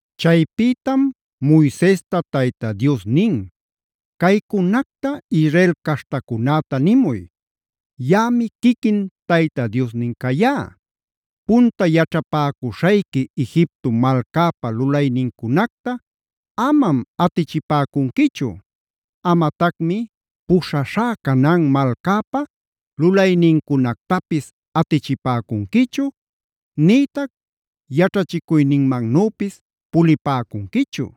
Chaypïtam Moisesta Tayta Dios nin: “Caycunacta Israel caśhtacunäta nimuy: Yaꞌami quiquin Tayta Diosnin cayá. “Punta yaćhapäcuśhayqui Egipto malcäpa lulaynincunacta amam atichipäcunquichu. Amatacmi puśhaśhá Canaan malcäpa lulaynincunactapis atichipäcunquichu, nïtac yaćhachicuyninmannüpis pulipäcunquichu.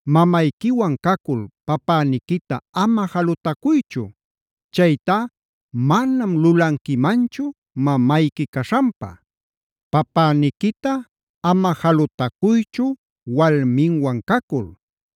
“Mamayquiwan cacul papäniquita ama jalutacuychu. Chaytá manam lulanquimanchu mamayqui caśhanpa. “Papäniquita ama jalutacuychu walminwan cacul.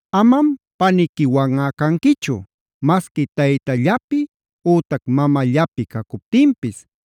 “Amam paniquiwanꞌa canquichu. Masqui taytallapi ütac mamallapi cacuptinpis,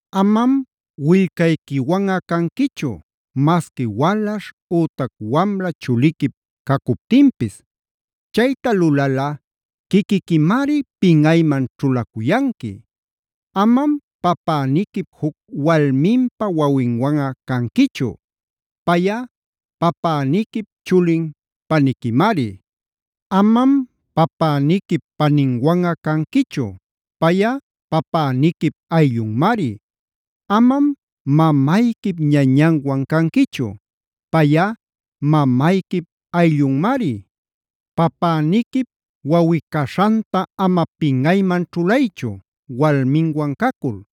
“Amam willcayquiwanꞌa canquichu, masqui walaśh ütac wamla chuliquip cacuptinpis. Chayta lulalꞌa quiquiquimari pinꞌayman ćhulacuyanqui. “Amam papäniquip juc walminpa wawinwanꞌa canquichu. Payꞌa papäniquip chulin paniquimari. “Amam papäniquip paninwanꞌa canquichu. Payꞌa papäniquip ayllunmari. “Amam mamayquip ñañanwan canquichu; payꞌa mamayquip ayllunmari. “Papäniquip wawꞌi-caśhanta ama pinꞌayman ćhulaychu walminwan cacul;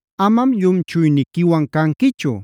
“Amam llumchuyniquiwan canquichu.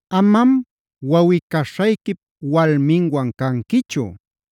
“Amam wawꞌi-caśhayquip walminwan canquichu.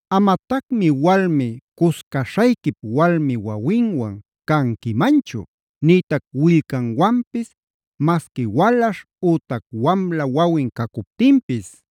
“Amatacmi walmi cuscaśhayquip walmi wawinwan canquimanchu, nïtac willcanwanpis, masqui walaśh ütac wamla wawin cacuptinpis.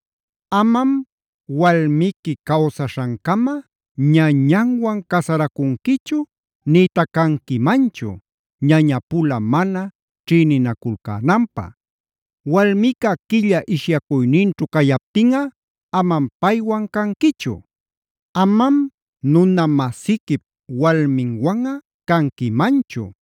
“Amam walmiqui cawsaśhancama ñañanwan casaracunquichu nïtac canquimanchu, ñañapula mana ćhïninaculcänanpä. “Walmica quilla ishyacuyninćhu cayaptinꞌa amam paywan canquichu.h “Amam nuna-masiquip walminwanꞌa canquimanchu.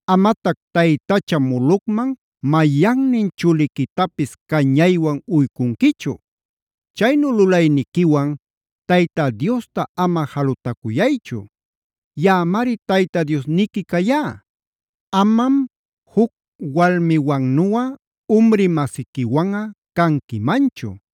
“Amatac taytacha Molocman mayannin chuliquitapis cañaywan uycunquichu. Chaynu lulayniquiwan Tayta Diosta ama jalutacuyaychu.j Yaꞌamari Tayta Diosniqui cayá. “Amam juc walmiwannuꞌa umri-masiquiwanꞌa canquimanchu.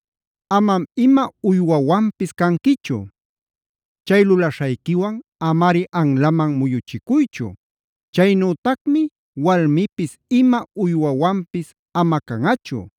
“Amam ima uywawanpis canquichu. Chay lulaśhayquiwan amari anlaman muyuchicuychu. Chaynütacmi walmipis ima uywawanpis ama canꞌachu.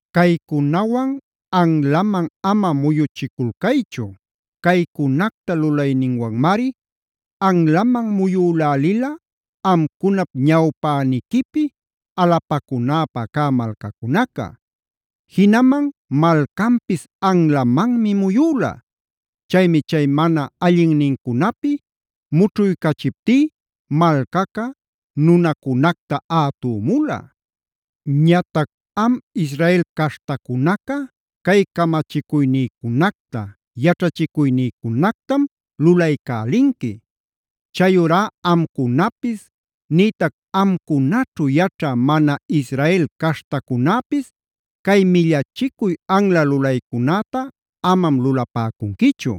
“Caycunawan anlaman ama muyuchiculcaychu. Caycunacta lulayninwanmari anlamam muyülälila amcunap ñawpäniquipi alapacunäpa cä malcacunaca. Jinaman malcanpis anlamanmi muyüla. Chaymi chay mana allinnincunapi mućhuycachiptí malcaca nunacunacta ätümula. Ñatac am Israel caśhtacunaca cay camachicuynïcunacta, yaćhachicuynïcunactam lulaycälinqui. Chayurá amcunapis nïtac amcunaćhu yaćhä mana Israel caśhtacunäpis cay millachicuy anla lulaycunäta amam lulapäcunquichu.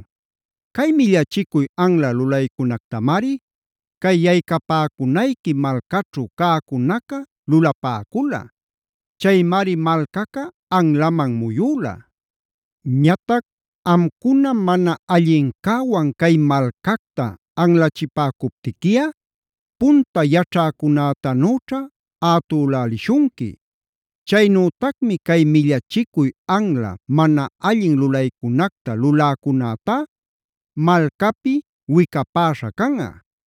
Cay millachicuy anla lulaycunactamari cay yaycapäcunayqui malcaćhu cäcunaca lulapäcula. Chaymari malcaca anlaman muyüla. Ñatac amcuna mana allincäwan cay malcacta anlachipäcuptiquiꞌa punta yaćhäcunätanüćha ätülälishunqui. Chaynütacmi cay millachicuy anla mana allin lulaycunacta luläcunätá malcapi wicapäśhä canꞌa.